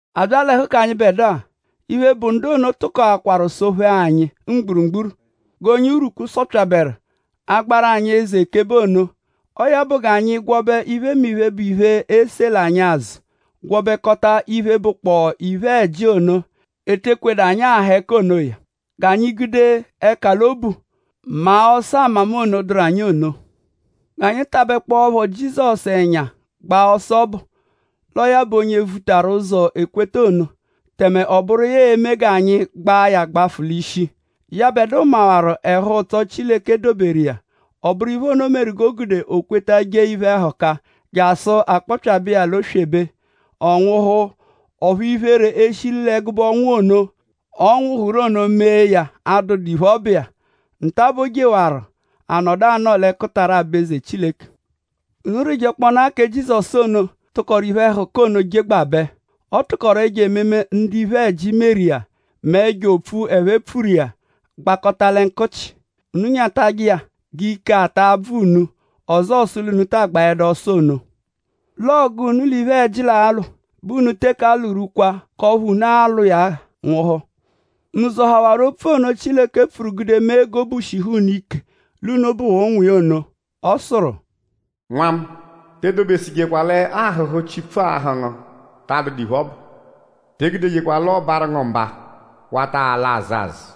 A bya l'ẹhu k'anyịbedua; iphe, bụ ndu ono tụkoakwaru sọ-phee anyi mgburugburu g'onye urwukpu sọpyaberu; agbaru anyi eze ekebe ono. Ọo ya bụ g'anyi gwọbe iphemiphe, bụ iphe, esela anyi azụ; gwọbekota iphe, bụkpoo iphe-ẹji ono, ete ekwedu anyi aha ẹka onoya. G'anyi gude ẹka l'obu maa ọso-amama ono, dụru anyi ono. G'anyi tabẹkpoepho Jizọsu ẹnya gba ọso ọbu; l'ọo ya bụ onye vutaru ụzo k'ekweta ono; tẹme ọ bụru iya e-me g'anyi gbaa ya gbafụ l'ishi. Yẹbedua mawaru ẹhu-ụtso, Chileke doberu iya; ọ bụru iphe ono meru g'o gude o kweta jee iphe-ẹhuka jasụ a kpọpyabe iya l'oswebe; ọ nwụhu; ọphu iphere, e shi l'ẹgube anwụhu ono, ọ nwụhuru ono mee ya adụdu iphe, ọ bụ iya. Nta-a bẹ o jewaru anọdu anọo l'ẹkutara aba-eze Chileke. Unu rịjekponaa kẹ Jizọsu ono, tụkoru iphe-ẹhuka ono jegbabẹ. Ọ tụkoru ẹjo ememe, ndu iphe-ẹji meru iya mẹ ẹjo opfu ẹphe pfuru iya gbagbukọta lẹ nkụchi. Unu nyatajẹ iya g'ike ata abvụdu unu; ọzoo sụ l'unu ta agbaẹdu ọso ono. L'ọgu, unu l'iphe-ẹji alwụ bẹ unu teke alwụ-rwukwa k'ọphu unu a-lwụ iya nwụhu. ?Unu zọhawaru opfu ono, Chileke pfuru gude mee g'obu shihu unu ike l'unu bụ ụnwu iya ono? Ọ sụru: “Nwa mu; te edobesụjekwa l'ahụ̀hù, Chipfu ahụ̀ ngu ta adụdu iphe, ọ bụ. Te egudejekwa l'ọ barụ ngu mba wata ala azụ azụ;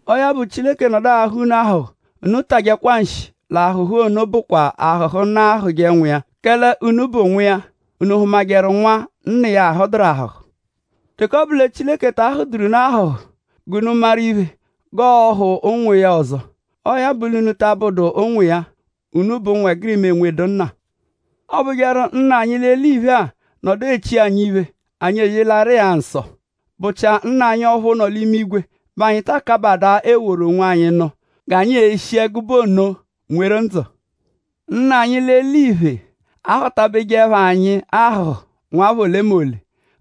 Ọo ya bụ; Chileke -nọdu ahụ̀ unu ahụ̀hù; unu tajẹkwa nshi; l'ahụ̀hù ono bụkwa ahụ̀hù, nna ahụ̀je nwa iya; kẹle unu bụ ụnwu iya.?Unu hụmajeru nwa, nna iya ahụduru ahụ̀hù? Teke ọ bụ lẹ Chileke ta ahụ̀du unu ahụ̀hù g'unu maru iphe g'ọohù ụnwu iya ọzo; ọo ya bụ l'unu ta abụdu ụnwu iya; unu bụ ụnwegirima, enwedu nna. Ọobujeru; nna anyi l'eliphe-a -nọdu echi anyi iphe; anyi eyelẹru phẹ-a nsọ.?Bụchia Nna anyi ọphu nọ l'imigwe bẹ anyi ta akabadaa eworu onwanyi nụ g'anyi eshi ẹgube ono nweru ndzụ. Nna anyi l'eliphe ahụ̀-tabejeẹpho anyi ahụ̀hù nwapha olemole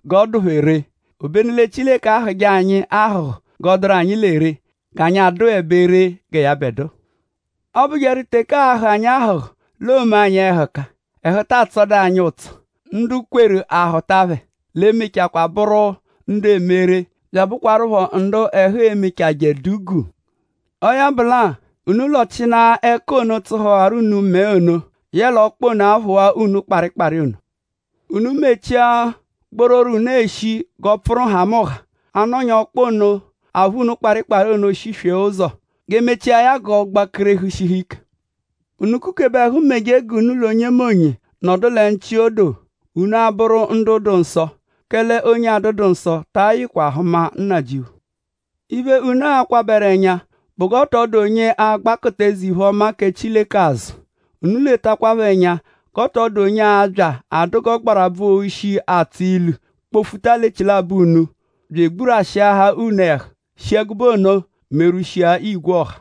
g'ọ dụ phẹ ree. Obenu lẹ Chileke ahụ̀je anyi ahụ̀hù g'ọo-dụru anyi lẹ ree; g'anyi adụebe ree gẹ yẹbedua. Ọobujeru teke aahụ̀ anyi ahụ̀hù l'oome anyi ẹhuka; ẹhu taa tsọdu anyi ụtso. Ndu kweru; a hụa phẹ hụta; l'emechajẹkwa bụru ndu eme ree; bya abụkwarupho ndu ẹhu emechajẹ dụ guu. Ọo ya bụ lẹ-a; unu lọchinaa ẹka ono, tsụhuwaru unu mẹe ono; yẹle ọkpa ono, aphụwaa unu kparịkpari ono. Unu mechia gbororo, unu eshi g'ọ pfụru nhamụnha; a -nọnyaa ọkpa ono, aphụ kparịkpari ono shiswee ụzo; g'e mechia ya g'ọ gbakerehu shihu ike. Unu kukebeje ẹhu meje g'unu l'onyemonye nọdu lẹ nchị odo; unu abụru ndu dụ nsọ; kẹle onye adụdu nsọ ta ayịkwa hụma Nnajịuphu. Iphe, unu a-kwabẹru ẹnya bụ g'ọ tọ dụ onye a-gbakụtaru eze-iphe-ọma kẹ Chileke azụ. Unu eletakwaphọ ẹnya g'ọ tọ dụ onye a-bya adụ g'ọgbarabvu-oshi, atsọ ilu kpọ-futa l'echilabọ unu bya egburwashịahaa unu ẹhu; shi ẹgube ono merwushia igwe ọha.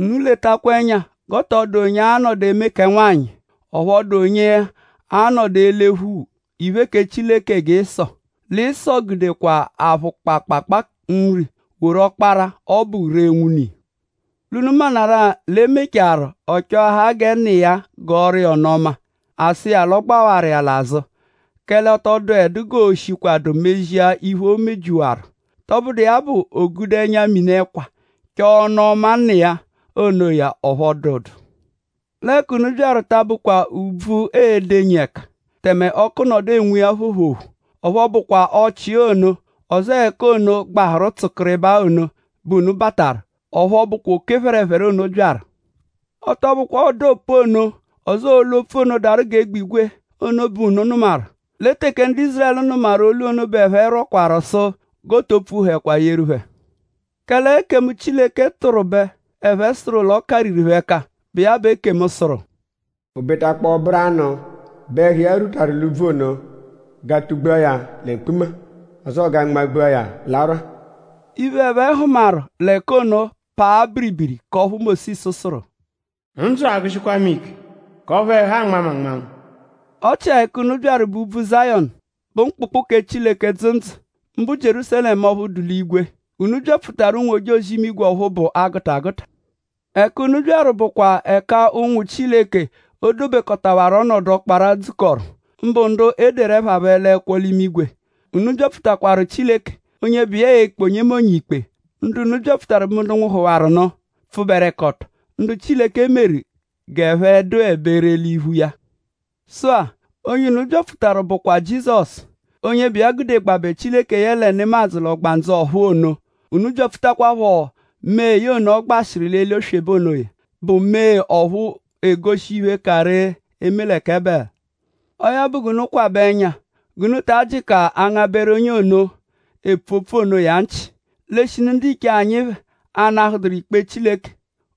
Unu letakwa ẹnya g'ọ tọ dụ onye a-nọdu eme kẹ nwanyị; ọphu ọ dụ onye anọdu elephu iphe, kẹ Chileke gẹ Ịso. Lẹ Ịso gudekwa aphụ kpaakpaakpaa nri; woru ọkpara, ọ bụ ree nwune iya. L'unu maanarụ-a l'e mechaarụ; ọ chọahaa gẹ nna iya gọoru iya ọnu-ọma. A sụ iya l'ọ gbawaru iya l'azụ; kẹle ọ tọ dụedu g'ooshikwadu emezi iphe, o mebyihawaru. Tọbudu iya bụ; o gude ẹnya-mini ẹkwa chọo ọnu-ọma nna iya onoya; ọphu ọ dụdu. L'ẹka unu byaru ta abụkwa úbvú, unu e-denyi ẹka; tẹme ọku, nọdu enwu iya phoophoophoo. Ọphu ọ bụkwa ọchii ono; ọzoo ẹka ono, gbahụru tsụkiribaa ono bẹ unu bataru. Ọphu ọ bụkwa oke phẹrephere ono byaru. Ọ tọ bụkwa ọda opu ono; ọzoo olu-opfu ono, daru g'egbigwe ono bẹ unu nụmaru. Lẹ teke ndu Ízurẹlu nụmaru olu ono bẹ ẹphe rwọkwaru sụ g'o to pfuhẹkwa yeru phẹ ọzo. Kẹle ekemu, Chileke tụru bẹ ẹphe sụru l'ọ kariru phẹ ẹka, bụ iya bụ ekemu sụru: “O betakpọo ọ bụru anụ bẹ ẹhu iya rwutaru l'úbvú ono g'a tugbua ya lẹ mkpuma; ọzoo g'a nmagbua ya l'arwa.” Iphe, ẹphe hụmaru l'ẹka ono paa biribiri; k'ọphu Mósisu sụru: “Ndzụ agụshikwa mu ike; k'ọphu ẹhu anma mu anmanma.” Ọ chia ẹka unu byaru bụ úbvú Zayọnu; mbụ mkpụkpu kẹ Chileke, dzụ ndzụ; mbụ Jierúsalẹmu ọphu dụ l'imigwe. Unu byapfutaru ụnwu-ojozi-imigwe ọphu bụ 'agụta agụta. Ẹka unu byaru bụkwa ẹka ụnwu Chileke, o dobekọtawaru l'ọnodu ọkpara dzukọru; mbụ ndu e deru ẹpha phẹ l'ẹkwo l'imigwe. Unu byapfutawaru Chileke; onye bụ iya e-kpe onyemonye ikpe. Ndu unu byapfutaru bụ ndu nwụhuhawaru nụ, pfụberekoto; ndu Chileke meru g'ẹphe dụebe ree l'iphu iya. Sụ-a; onye unu byapfutaru bụkwa Jizọsu; onye bụ iya gudegbabẹ Chileke yẹle nemadzụ l'ọgbandzu ọ̀phúú ono; unu byapfutakwaphọ mee ono, ọ gbashịru l'oswebe onoya, bụ mee ọphu egoshi iphe, ka ree eme lẹ kẹ Ebẹlu. Ọo ya bụ g'unu kwabẹ ẹnya g'unu ta jịka angabẹru onye ono, epfu opfu onoya nchị. L'eshinu ndiche anyi phẹ anahụduru ikpe Chileke;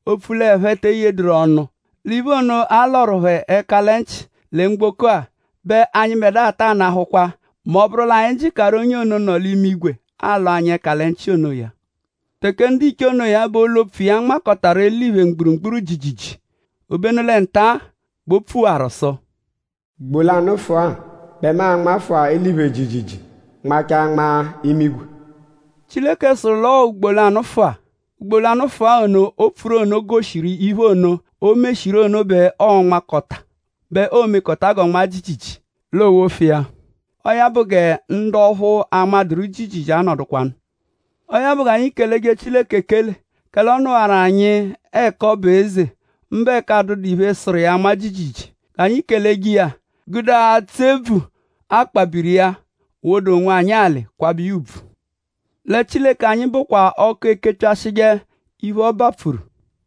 opfu l'ẹphe te eyeduru ọnu l'iphe ono, a lọru phẹ ẹka lẹ nchị lẹ mgboko-a bẹ anyịbedua taa nahụkwa mẹ ọ -bụru l'anyi jịkaru onye ono, nọ l'imigwe alọ anyi ẹka lẹ nchị onoya. Teke ndiche onoya bẹ olu-opfu iya nmakọtaru eliphe mgburugburu jiijiijii; obenu lẹ nta-a bẹ o pfuwaru sụ: “Ugbo lanụfua bẹ mu a-nmafụa eliphe jiijiijii; nmachaa nmaa imigwe.” Chileke sụru l'ọo “ugbo lanụfua.” Ugbo lanụfua ono, o pfuru ono goshiru l'iphe ono, o meshiru ono bẹ oo-mekọta g'ọ nmaa jiijiijii; l'oowofu iya. Ọo ya bụ gẹ ndu ọphu anmadụru jiijiijii anọdukwanu. Ọo ya bụ g'anyi keleje Chileke ekele; kẹle ọ nụwaru anyi ẹka ọ bụ eze; mbụ ẹka adụdu iphe sụru iya anma jiijiijii. G'anyi keleje iya; gudeje atsụ ebvu akpabiri iya; woda onwanyi alị; kwabẹje iya ùbvù; lẹ Chileke anyi bụkwa ọku, ekepyashịje iphe, ọ bapfuru.